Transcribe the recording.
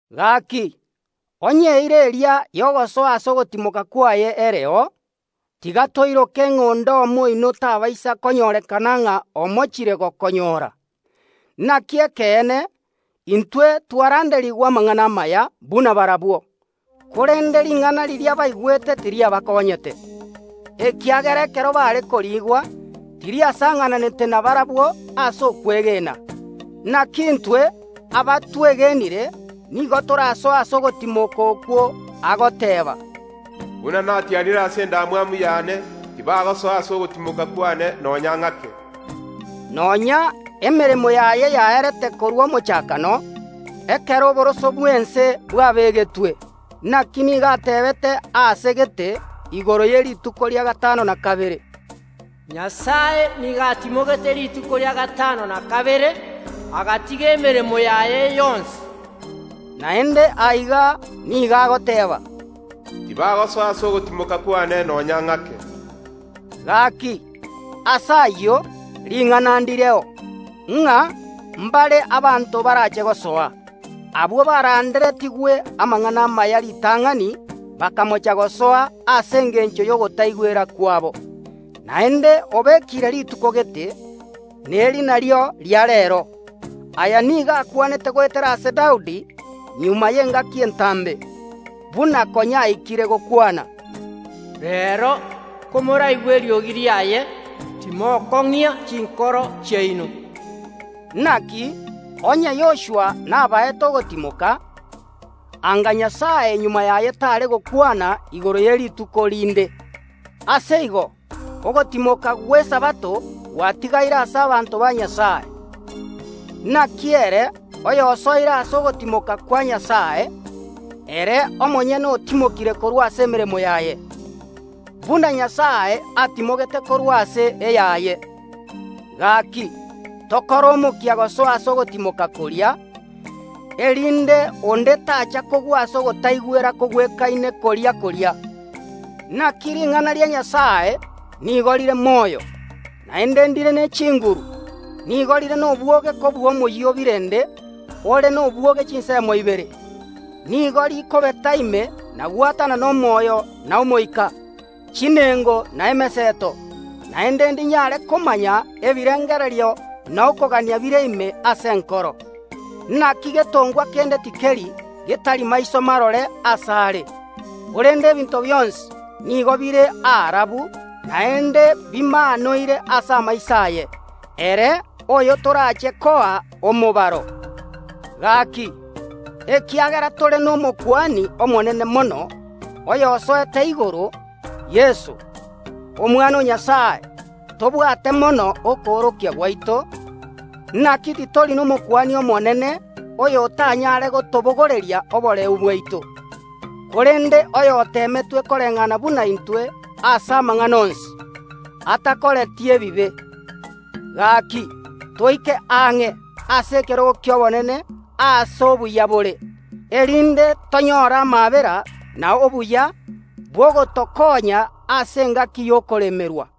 Gaki, onye eira eria y’ogosoa ase ogotimoka kwaye ereo, tiga toiroke ng’a onde omo oino tabaisa konyorekana ng’a omochire gokonyora. Naki ekeene, intwe twaranderigwe amang’ana amaya buna barabwo. Korende ring’ana riria baigwete tiriabakonyete, ekiagera ekero baare koriigwa tiriasang’ananete nabarabwo ase okwegena. Naki intwe, abatwegenire, nigo torasoe ase ogotimoka okwo agoteeba, “Buna natianire ase endamwamu yane, Tibagosoa ase ogotimoka kwane nonya ng’ake”, nonya emeremo yaye yaerete korwa omochakano, ekero oboroso bw’ense bwabegetwe. Naki nigo ateebete aase gete igoro ye rituko ria gatano na kabere, “Nyasae nigo atimogete rituko ria gatano na kabere, agatiga emeremo yaye yonsi.” Naende aiga nigo agoteeba, “Tibagosoa ase ogotimoka kwane nonya ng’ake.” Gaki, ase ayio ring’ana ndireo, ng’a mbare abanto barache gosoa. Abwo baranderetigwe amang’ana amaya ritang’ani bakamocha gosoa ase engencho y’ogotaigwera kwabo. Naende obekire rituko gete, neri nario ria Reero. Aya nigo akwanete goetera ase Daudi magega y’engaki entambe, buna konya aikire gokwana, “Reero, komoraigwe eriogi riaye, timokong’ia chinkoro chiaino.” Naki onye Yoshua nabaete ogotimoka, anga Nyasae magega yaye tare gokwana igoro ye rituko rinde. Ase igo, ogotimoka gw’esabato gwatigaire ase abanto ba Nyasae. Naki ere oyosoire ase ogotimoka kwa Nyasae, ere omonyene otimokire korwa ase emeremo yaye, buna Nyasae atimogete korwa ase eyaye. Gaki, tokore omokia gosoa ase ogotimoka koria, erinde onde tacha kogwa ase ogotaigwera kogwekaine koria koria. Naki ring’ana ria Nyasae nigo rire moyo, naende ndire ne chinguru, nigo rire nobwoge kobua omoyio o birende ore nobwoge chinsemo ibere. Nigo rikobeta ime na gwatanana omoyo na omoika, chinengo na emeseto, naende ndinyare komanya ebirengererio na okogania bire ime ase enkoro. Naki getongwa kende tikeri getari maiso marore asare, korende ebinto bionsi nigo bire aarabu naende bimaanoire ase amaiso aye, ere oyo torache koa omobaro. Gaki, ekiagera tore n’Omokuani Omonene mono, oyosoete igoro, Yeso, Omwana o Nyasae, tobwate mono okoorokia gwaito. Naki titori n’Omokuani Omonene oyotanyare gotobogoreria oboreu bwaito, korende oyoteemetwe koreng’ana buna intwe ase amang’ana onsi, atakoreti ebibe. Gaki, toike ang’e ase ekerogo ki’obonene aase obuya bore, erinde tonyore amaabera na obuya bw’ogotokonya ase engaki y’okoremerwa.